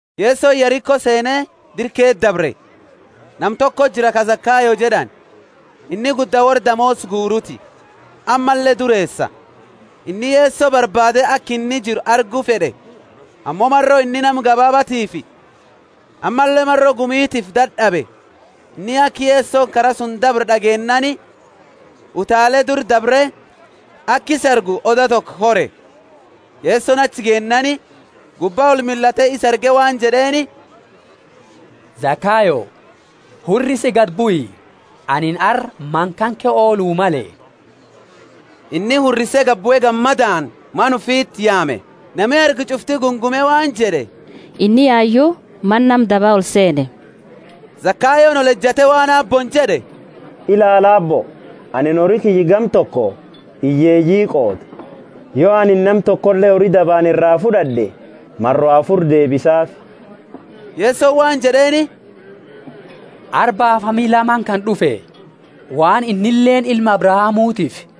Yesoni Yeriko seene dira keesa dabre. Nama tokoti jira ka Zakayo jed'ani; inni gudda worra damoosa guuruti, ammalle dureesa. Inni Yeso barbaade aka inni jiru argu fed'e; ammo maro inni nama gabaabatiifi, ammalle maro gumitiifi dad'abe. Inni aka Yesoni kara suni dabru d'ageennaani utaale dura dabre aka isa argu oda toko kore. Yesoni achi geennaani gubba olmillate isa arge waan jed'eeni, Zakayo, hurrisi gadi bui, anini arra mana kanke oolu male. Inni hurrise gabue gammadaani mana ufiti yaame. Nami arge ch'ufti gungume waan jed'e, Inni yayu mana nama daba olseene. Zakayooni olejate waan Aabbooni jed'e, Ilaali, Aabbo, anini hori kiyya gama toko hiyyeeyii qooda; yo anini nama tokole hori dabaani ira fud'ad'e, maro afuri deebisaafi. Yesoni waan jed'eeni, Arra baafami la mana kana d'ufe, waan innileeni ilma Abrahamutiifi.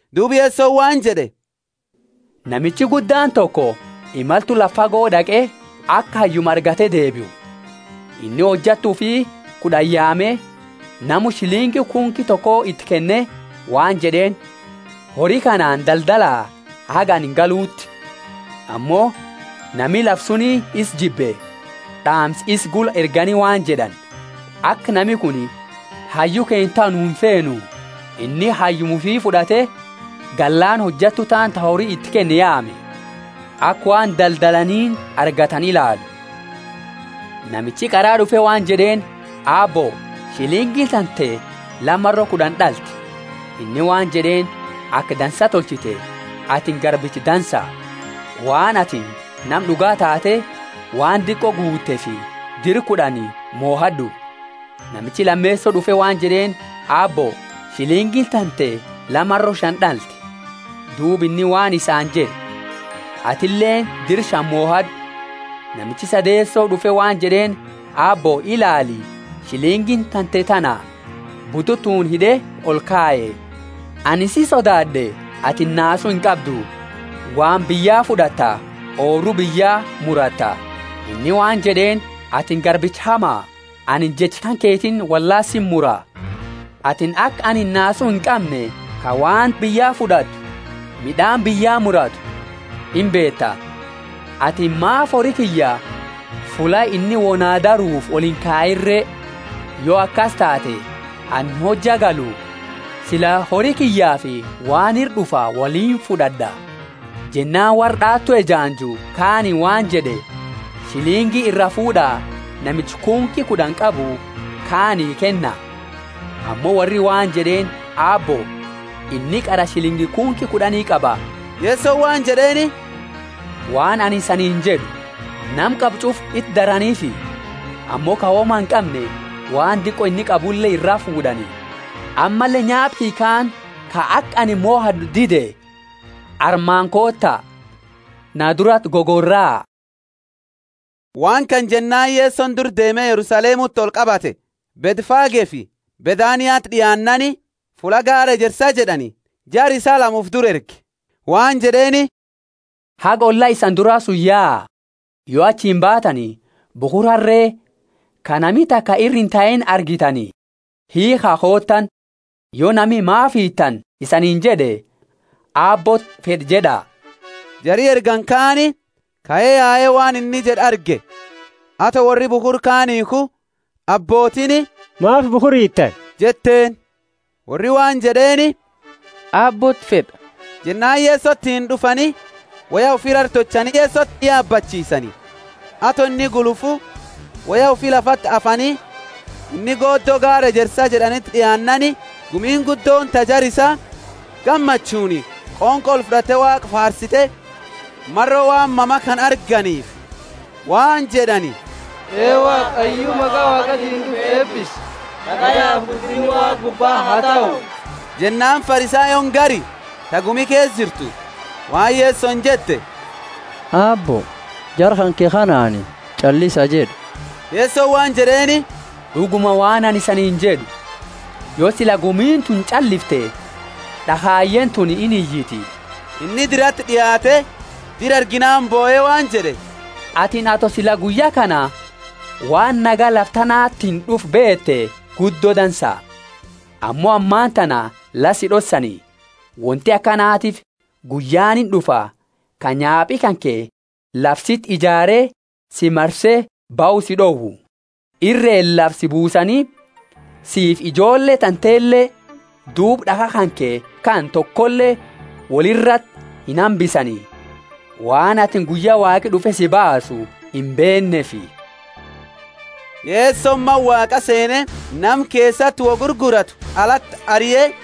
Duuba Yesoni waan jed'e, Namicha guddaani toko imaltu lafa fago d'aqe, aka hayyuma argate deebiu. Inni hojattu ufi kud'ani yaame namu shilingi kunki toko iti keenne waan jed'eeni, Hori kanaani daldala, haga anini galuuti. Ammo nami lafa suni isa jibbe, d'aamsa isa gula ergani waan jed'ani, Aka nami kuni hayyu keenna tahu nu imfeenu. Inni hayyuma ufi fud'ate, gallaani hojattu taani ta hori iti kenne yaame, aka waan daldalaniini argatani ilaalu. Namichi qara d'ufe waan jed'eeni, Aabbo, shilingiini tante la maro kud'ani d'alte. Inni waan jed'eeni, Aka dansa tolchite, atini garbicha dansa! Waan atini nama d'uga taate waan diqo guuteefi dira kud'ani mohad'u. Namichi lameeso d'ufe waan jed'eeni, Aabbo, shilingiini tante la maro shani d'alte. Duuba inni waan isaani jed'e, Atileeni dira shani mohad'u. Namichi sadeeso d'ufe waan jed'eeni, Aabbo, ilaali, shilingiini tante tana; bututuuni hid'e olkaye. Anini si sodaad'e, atini naasu inqabdu. Waan biyya fud'atta oobru biyya muratta. Inni waan jed'eeni, atini garbicha hama! Anini jecha kanketiini wollaala siti mura! Atini aka anini nasu inqamne, ka waan biyya fud'atu, mid'aani biyya muratu, imbeeta. Atini maafi hori kiyya fulla inni wo na daruufi olinkayiini re? Yo akasi taate, anini hojja galu, sila hori kiyyafi waan ira d'ufa woliini fud'ad'a. Jennaani worra d'aawatu ejaanju kaaniini waan jed'e, Shilingi iraa fuud'a namicha kunki kud'ani qabu kaani kenna. Ammo worri waan jed'eeni Aabbo, inni qara shilingi kunki kud'ani qaba. Yesoni waan jed'eeni, waan anini isaniini jed'u, Nama qabu ch'ufa iti daraniifi, ammo ka woma inqamne waan diqo inni qabule iraa fuud'ani. Ammalle nyaapa kiyya kaani, ka aka anini mohad'u dide, armaani koota, na durati gogoraa. Waan kana jennaani Yesoni dura deeme Yerusalemuti olqabate. Bethfagefi Bethaniati d'iaannaani, fulla gaara Ejersa jed'ani, jara isaa lama ufi dura erge waan jed'eeni, Haga olla isani dura suni yaa, yo achiini baatani bukhura harre ka nami taka ira intaini argitani, hiikha kootaani. Yo nami, Maafi hiitani? isaniini jed'e, Aabbooti fed'a jed'a. Jari ergani kaani kae yae waan inni jed'e arge. Ato worri bukhura kaani hiikhu, abbootiini, Maafi bukhura hiitani? jetteeni. Worri waan jed'eeni, Aabbooti fed'a. Jennaani Yesotiini d'ufani, woya ufi rara tolchani Yeso yabachiisani. Ato inni gulufu, woya ufi lafati afani. Inni goodo gaara Ejersa jed'aniti d'iaannaani, gumiini guddooni ta jara isaa, gammachuuni qonqo olfud'ate Waaqa faarsite, maro waan mama kana arganiifi. Waan jed'ani, Ee Waaqa hayyu maqa Waaqatiini d'ufu eebisi! Nagayafi guddinni Waaqa gubbaa ha tahu! Jennaani Farisayooni gari, ta gumi keesa jirtu, waan Yesoni jette, Aabbo, jara kanke kanaani, Ch'allisa jed'i. Yesoni waan jed'eeni, D'uguma waan anini isaniini jed'u, Yo sila gumiini tuni ch'allifte, d'akhayeeni tuni iniyiti. Inni dirati d'iaate, dira arginaani bohe waan jed'e, Atini ato sila guyya kana waan nagaya, lafa tanatiini d'ufa beete, guddo dansa! Ammo ammatana la si d'ossani. Wonti akanatiifi guyyaani ind'ufa, ka nyaapi kanke lafa siti ijaare si marse bahu si d'owu. Irreeni lafa si buusani, siifi ijoolle tantele, duuba d'akha kanke kana tokole woli irati inhambisani, waan atini guyya Waaqi d'ufe si baasu imbeenneefi. Yesoni Mana Waaqa seene nama keesati wo gurguratu alati arie